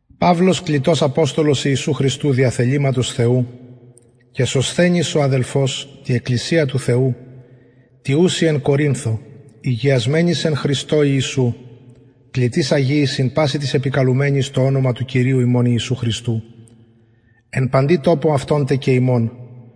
παυλος κλητος αποστολος ιησου χριστου δια θεληματος θεου και σωσθενης ο αδελφος τη εκκλησια του θεου τη ουση εν κορινθω ηγιασμενοις εν χριστω ιησου κλητοις αγιοις συν πασιν τοις επικαλουμενοις το ονομα του κυριου ημων ιησου χριστου εν παντι τοπω αυτων τε και ημων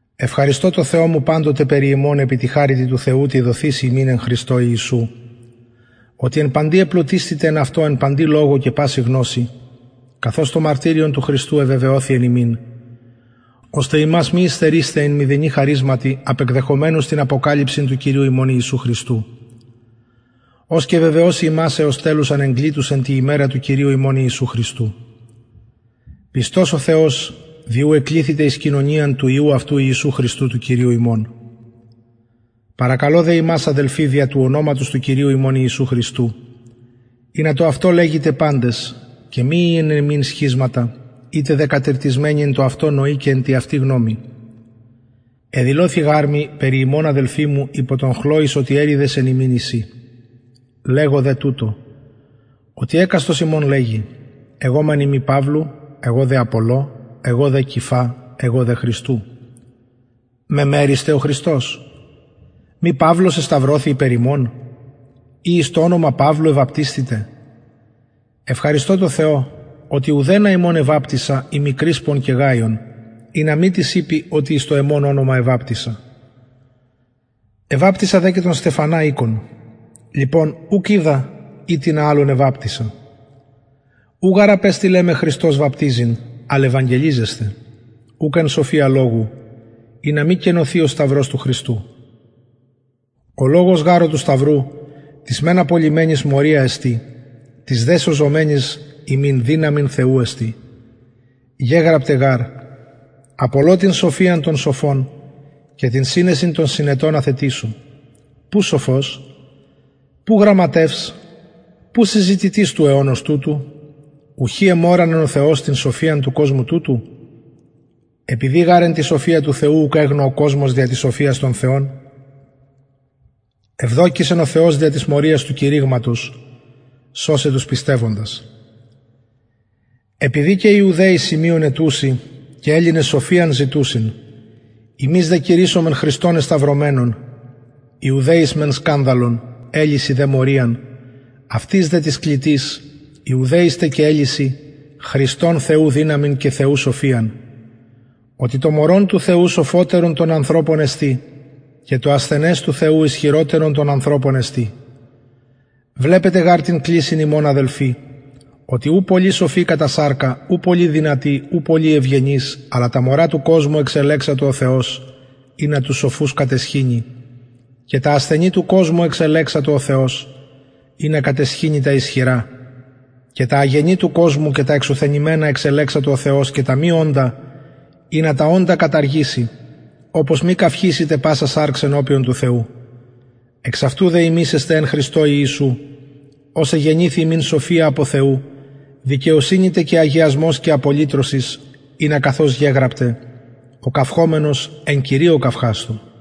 ευχαριστω τω θεω μου παντοτε περι υμων επι τη χαριτι του θεου τη δοθειση υμιν εν χριστω ιησου οτι εν παντι επλουτισθητε εν αυτω εν παντι λογω και παση γνωσει καθως το μαρτυριον του χριστου εβεβαιωθη εν υμιν ωστε υμας μη υστερεισθαι εν μηδενι χαρισματι απεκδεχομενους την αποκαλυψιν του κυριου ημων ιησου χριστου ος και βεβαιωσει υμας εως τελους ανεγκλητους εν τη ημερα του κυριου ημων ιησου χριστου πιστος ο θεος δι ου εκληθητε εις κοινωνιαν του υιου αυτου ιησου χριστου του κυριου ημων παρακαλω δε υμας αδελφοι δια του ονοματος του κυριου ημων ιησου χριστου ινα το αυτο λεγητε παντες και μη η εν υμιν σχισματα ητε δε κατηρτισμενοι εν τω αυτω νοι και εν τη αυτη γνωμη εδηλωθη γαρ μοι περι υμων αδελφοι μου υπο των χλοης οτι εριδες εν υμιν εισιν λεγω δε τουτο οτι εκαστος υμων λεγει εγω μεν ειμι παυλου εγω δε απολλω εγω δε κηφα εγω δε χριστου μεμερισται ο χριστος μη παυλος εσταυρωθη υπερ υμων η εις το ονομα παυλου εβαπτισθητε ευχαριστω τω θεω οτι ουδενα υμων εβαπτισα ει μη κρισπον και γαιον ινα μη τις ειπη οτι εις το εμον ονομα εβαπτισα εβαπτισα δε και τον στεφανα οικον λοιπον ουκ οιδα ει τινα αλλον εβαπτισα ου γαρ απεστειλεν με χριστος βαπτιζειν αλλ ευαγγελιζεσθαι ουκ εν σοφια λογου ινα μη κενωθη ο σταυρος του χριστου ο λογος γαρ ο του σταυρου τοις μεν απολλυμενοις μωρια εστιν τοις δε σωζομενοις ημιν δυναμις θεου εστιν γεγραπται γαρ απολω την σοφιαν των σοφων και την συνεσιν των συνετων αθετησω που σοφος που γραμματευς που συζητητης του αιωνος τουτου ουχι εμωρανεν ο θεος την σοφιαν του κοσμου τουτου επειδη γαρ εν τη σοφια του θεου ουκ εγνω ο κοσμος δια της σοφιας τον θεον ευδοκησεν ο θεος δια της μωριας του κηρυγματος σωσαι τους πιστευοντας επειδη και ιουδαιοι σημειον αιτουσιν και ελληνες σοφιαν ζητουσιν ημεις δε κηρυσσομεν χριστον εσταυρωμενον ιουδαιοις μεν σκανδαλον ελλησιν δε μωριαν αυτοις δε τοις κλητοις ιουδαιοις τε και ελλησιν χριστον θεου δυναμιν και θεου σοφιαν οτι το μωρον του θεου σοφωτερον των ανθρωπων εστιν και το ασθενες του θεου ισχυροτερον των ανθρωπων εστιν βλεπετε γαρ την κλησιν υμων αδελφοι οτι ου πολλοι σοφοι κατα σαρκα ου πολλοι δυνατοι ου πολλοι ευγενεις αλλα τα μωρα του κοσμου εξελεξατο ο θεος ινα τους σοφους καταισχυνη και τα ασθενη του κοσμου εξελεξατο ο θεος ινα καταισχυνη τα ισχυρα και τα αγενη του κοσμου και τα εξουθενημενα εξελεξατο ο θεος και τα μη οντα ινα τα οντα καταργηση οπως μη καυχησηται πασα σαρξ ενωπιον του θεου εξ αυτου δε υμεις εστε εν χριστω ιησου ος εγενηθη ημιν σοφια απο θεου δικαιοσυνη τε και αγιασμος και απολυτρωσις ινα καθως γεγραπται ο καυχωμενος εν κυριω καυχασθω